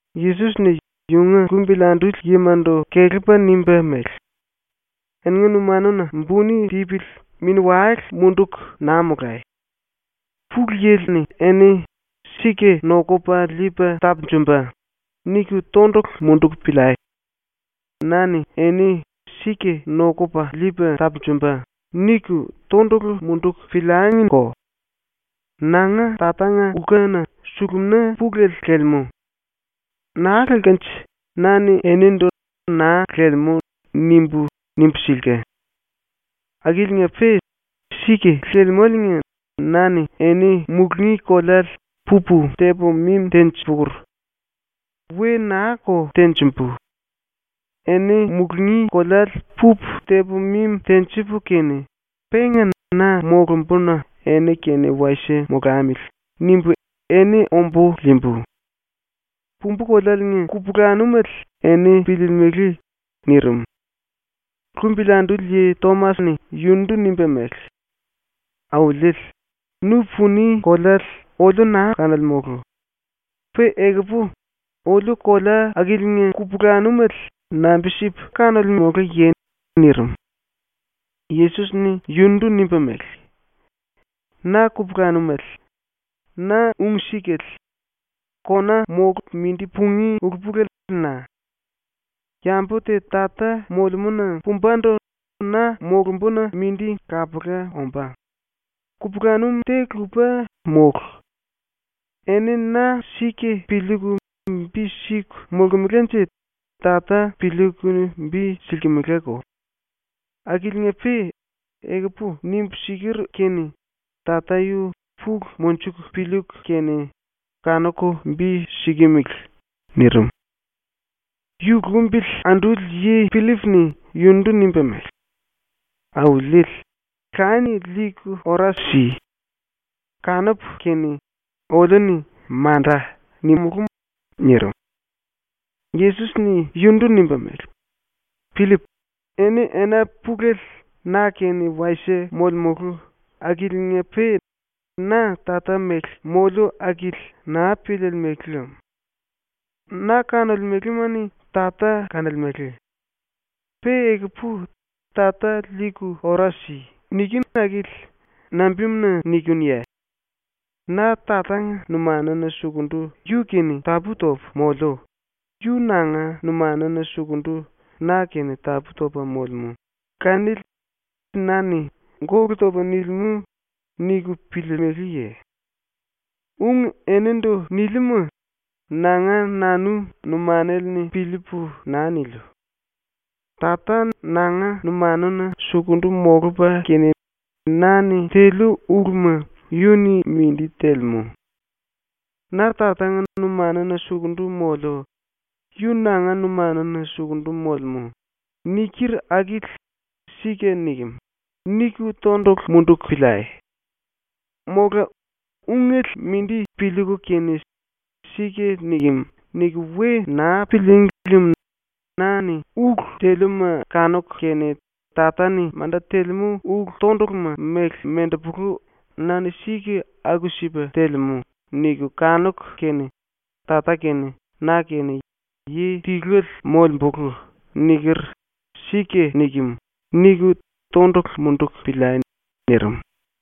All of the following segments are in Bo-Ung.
⸤Yesos-ni yunga lumbili anduli yimandu kelepa nimba mele:⸥ “Eni numanuna buni tipili mini-wale munduku naa molai. Pulu Yili eni ‘Sika ⸤nokupa liipa tapunjumba⸥.’ niku tondulu munduku piliai. Na-ni eni ‘Sika ⸤nokupa liipa tapunjumba⸥.’ niku tondulu munduku piliangiko. Nanga Tatanga lkuna sulumina pulele lelemú. Naa lelkanje na-ni enindu “Naa lelemú.” nimbu, nimbu silka. Akiliinga-pe sika lelemáliinga na-ni eni mulungí koleale pupu tepu mimi tenji-pukur. We naa-ko tenjimbu. Eni mulungí koleale pupu tepu mimi tenjipu kene, penga na molumbuna ‘Eni kene wasie molamili.’ nimbu eni ombu liimbu. Pumbu kolealiinga kupulanumele eni piliilimili.” nirim. ⸤Lumbili anduli yi⸥ Tomas-ni yundu nimba mele: “Auliele, nu puni koleale oliu naa kanolemulu. Pe ekupu oliu kolea akiliinga kupulanumele nambi-sipu kanolemuluye?” nirim. Yesos-ni yundu nimba mele: “Na kupulanumele, na ung-sikale, kona molku mindi pungí ulu-pulele na. Yambu te Tata molemúna pumbandu na molumbuna mindi kapula ombá. Kupulanum te-lupa mólu. Eni na sika piliiku bi siku molkemelanje Tata piliiku bi silkimelako. Akiliinga-pe ekupu nimbu siker kene Tata yu pulu monjuku piliiku kene kanuku bi sikimili.” nirim. ⸤Yu lumbili anduli yi⸥ Pillip-ni yundu nimba mele: “Auliele, Lanie liiku ora si. Kanupu kene oliu-ni “Manda.” nimulú.” nirim. Yesos-ni yundu nimba mele: “Pillip, eni ena pulele na-kene wasie molemulu akiliinga-pe na Tata mele moliu akili naa piliilimili lem. Na kanolemelema-ni Tata kanolemele. Pe ekupu “Tata liiku ora si.” nikinu akili nambimuna nikinuye? Na Tatanga numanuna sukundu yu-kene tapú-topu moliu, yu nanga numanuna sukundu na-kene tapú-topa molemú, kanili na-ni ‘Gólu topa nilimú.’ niku piliilimiliye? Ung enindu niliuma nanga nanu numanale-ni piliipu naa niliu. Tata nanga numanuna sukundu molupa kene na-ni teliu uluma yu-ni mindi telemú. “Na Tatanga numanuna sukundu moliu, yu nanga numanuna sukundu molemú.” niker akili ‘Sika nikem.’ niku tondulu munduku piliai. Mola ungele mindi piliiku kene ‘Sika nikem.’ niku we naa pilííngi lem na-ni ulu teliuma kanuku kene ‘Tata-ni manda telemú ulu-tonduluma mele mendepolu na-ni sika aku-sipa telemú.’ niku kanuku kene “Tata kene na kene yi tiluele molembulu.” niker ‘Sika nikem.’ niku tondulu munduku piliai.” ⸤nirim.⸥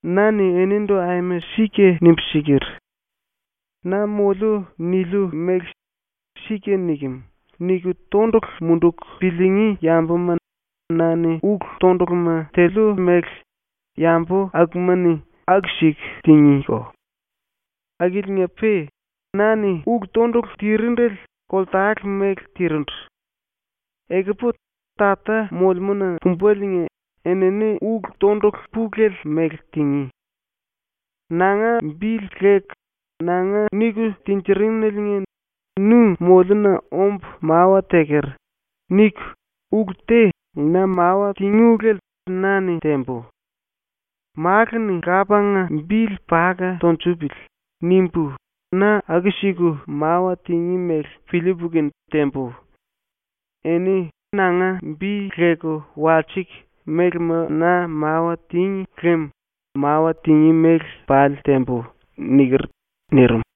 “Na-ni enindu aima sika nimbu siker: “Na moliu niliu mele ‘Sika nikem.’ niku tondulu munduku piliingí yambuma na-ni ulu-tonduluma teliu mele yambu akuma-ni aku-siku tingíko. Akiliinga-pe na-ni ulu-tondulu tirindele koltale mele tirindu. Ekupu Tata molemúna pumbaliinga enini ulu-tondulu pulele mele tingí. Nanga bili leku ⸤‘nanga niku tinjirineliinga nu molluna ombu mawa teker.’ niku⸥ ulu te na mawa tingí ulele na-ni tembu. ‘Málu-ni Lapanga bili paka tunjupili.’ nimbu na aku-siku mawa tingí mele piliipu kene tembu. Eni nanga bi leku walsiku mélema na mawa tíngi lem mawa tingí mele pali tembu.” niker.” ⸤nirim.⸥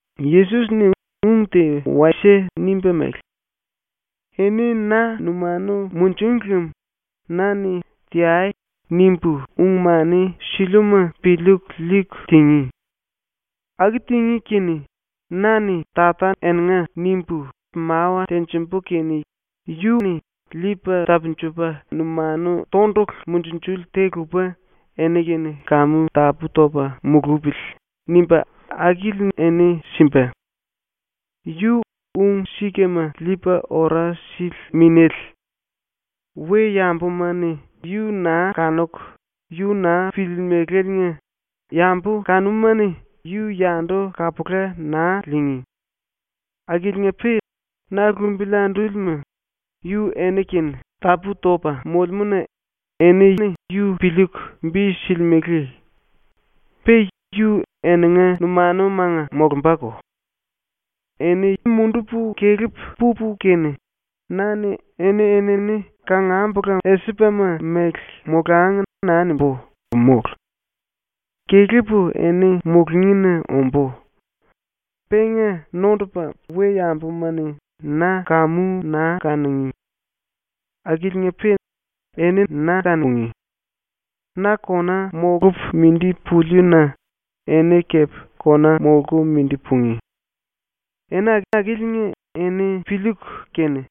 ⸤Yesos-ni ung te wasie nimba mele:⸥ “Eni na numanu munjung lem na-ni “Teai!” nimbu ung-mani siliuma piliiku liiku tingí. Aku tingí kene na-ni Tata eninga nimbu mawa tenjimbu kene yu Liipa Tapunjupa Numanu Tondulu Munjunjuli te lupa ‘Eni-kene kamu tapú-topa mulupili.’ nimba akili eni simba. Yu Ung-Sikama Liipa Ora Sili Minéle. we-yambuma-ni yu naa kanuku yu naa piliilimiláliinga, yambu kanuma-ni yu yandu kapula naa liingí. Akiliinga-pe na lumbili andúlima, yu eni-kene tapú-topa molemú-na, eni yu piliiku bi silimele. Pe yu eninga numanumanga molumbako. “Eni mundupu kelepu pupu kene, na-ni ‘Eni-enini kangambula esipama mele molangi.’ naa nimbú, mólu. Kelepu eni mulungína ombú. Penga nondupa we-yambuma-ni na kamu naa kanungí. Akiliinga-pe eni na kanungí. Na kona molupu mindi puliu-na eni kepe kona molku mindi pungí. Ena akiliinga eni piliiku kene,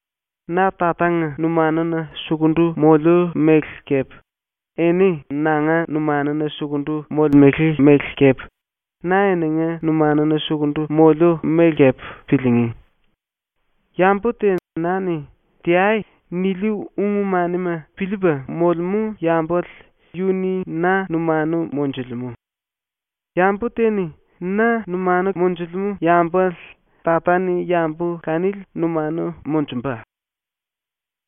‘Na Tatanga numanuna sukundu moliu mele kepe, eni nanga numanuna sukundu molemele mele kepe, na eninga numanuna sukundu moliu mele kepe’ piliingí. Yambu te na-ni “Teai.” niliu ung-manima piliipa molemú yambale yu-ni na numanu monjulemú. Yambu te-ni na numanu monjulemú yambale Tata-ni yambu kanili numanu monjumba.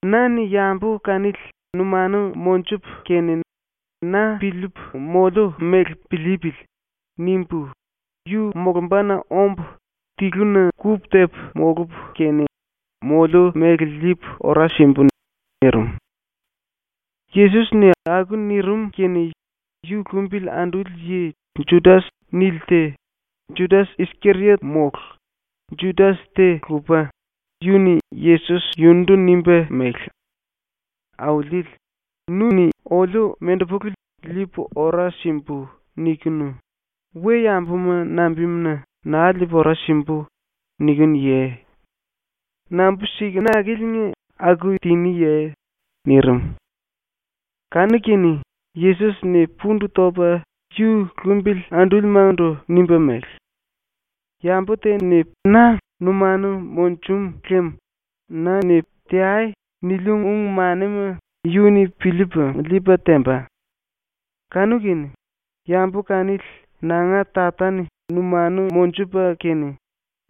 Na-ni yambu kanili numanu monjupu kene ‘Na piliipu moliu mele piliipili.’ nimbu yu molumbana ombu tiluna kupu-tepu molupu kene moliu mele liipu ora simbu.” nirim. Yesos-ni aku nirim kene ⸤yu lumbili anduli yi⸥ ‘Judas’ nili te, Judas-Iskeriot mólu, Judas te-lupa, yu-ni Yesos yundu nimba mele: “Auliele, nu-ni oliu mendepulu “liipu ora simbu.” nikinu, we-yambuma nambimuna “Naa liipu ora simbu.” nikinuye? Nambi-sikunaliinga aku tiniye?” nirim. Kanu-kene Yesos-ni pundu topa yu lumbili andúlimandu nimba mele: “Yambu te-ni na numanu munjum lem na-ni “Teai!” niliu ung-manima yu-ni piliipa liipa temba. Kanu-kene yambu kanili nanga Tata-ni numanu monjupa kene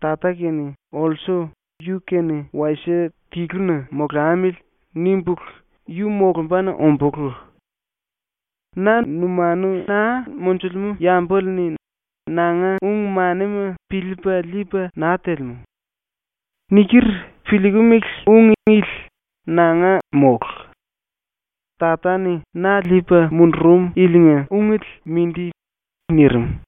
Tata kene olsu ‘Yu-kene wasie tiluna molamili.’ nimbulu yu molumbana ombulú. Na numanu naa monjulemú yambale-ni nanga ung-manima piliipa liipa naa telemú. Niker piliikimili ung ili nanga mólu. Tata-ni na liipa mundurum yilinga ungele mindi.” ⸤nirim.⸥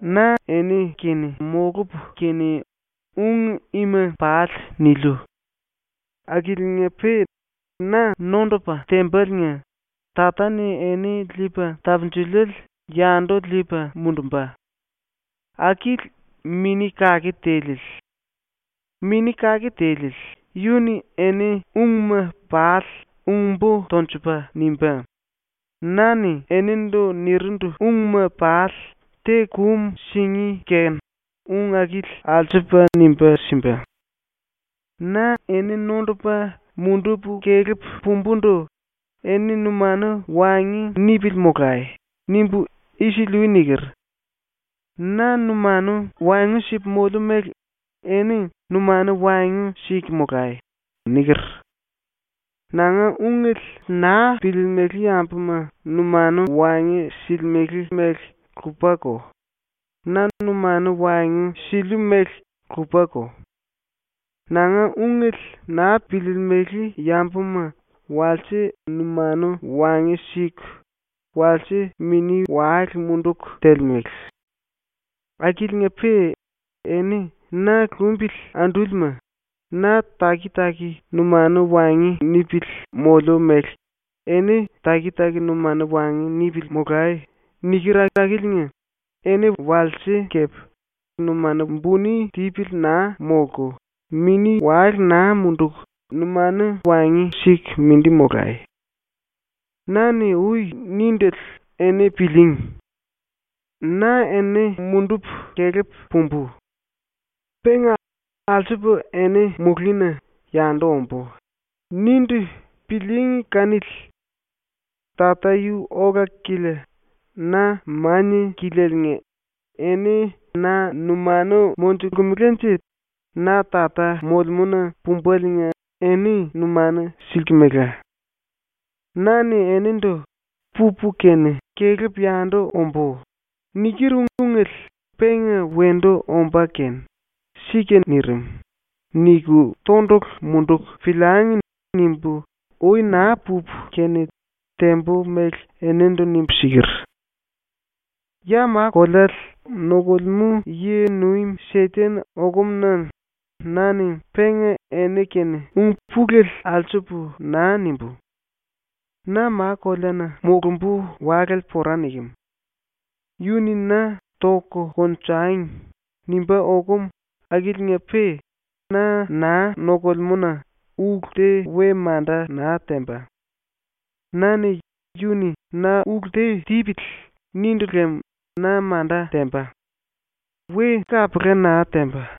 “Na eni-kene molupu kene ung ima pali niliu. Akiliinga-pe na nondupa tembaliinga Tata-ni eni Liipa Tapunjuliele yandu liipa mundumba. Akili Mini Kake Tiliele. Mini Kake Tiliele yu-ni eni ungma pali ung-bo tonjupa nimbá; na-ni enindu nirindu ungma pali te kum singí kene ung akili alsupa nimba simba. “Na ⸤eni nondupa mundupu kelepu pumbundu⸥ “Eni numanu waengu nipili molai.” nimbu isili-ui niker. “Na numanu waengu sipu moliu mele eni numanu waengu siku molai.” niker. Nanga ungele naa piliilimili yambuma numanu waengu silimele mele lupako; na numanu waengu siliu mele lupako. Nanga ungele naa piliilimili yambuma walse numanu waengu siku walse mini-wale munduku telemele. Akiliinga-pe eni na lumbili andúlima, “Na taki-taki numanu waengu nipili moliu mele eni taki-taki numanu waengu nipili molai.” niker akiliinga eni walse kepe numanu buni tipili naa molku mini-wale naa munduku numanu waengu siku mindi molai. “Na-ni ui nindele eni pilííngi. “Na eni mundupu kelepu pumbu. Penga alsupu eni mulungína yandu ombú.” nindu pilííngi kanili. Tata yu ola-kilia na mania-kilialiinga eni na numanu monjulkemelanje na Tata molemúna pumbaliinga eni numanu silkimela. Na-ni enindu “Pupu kene kelepu yandu ombú.” niker ungele penga wendu ombá kene ‘ ‘Sika nirim.’ niku tondulu munduku piliangi.’ nimbu ui naa pupu kene tembu mele enindu nimbu siker. “Ya ma-koleale nokulemú yi-nuim ⸤Seten⸥ okumu-na na-ni penga eni-kene ung pulele alsupu naa nimbú. ⸤Na ma-koleana molumbu walale pora nikem. Yu-ni na ‘Toku konjangi.’ nimbá okum⸥ akiliinga-pe na naa nokolemú-na ulu te we manda naa temba. ⸤Na-ni ‘Yu-ni na ulu te tipili.’ nindu lem na manda temba. We kapula naa temba.⸥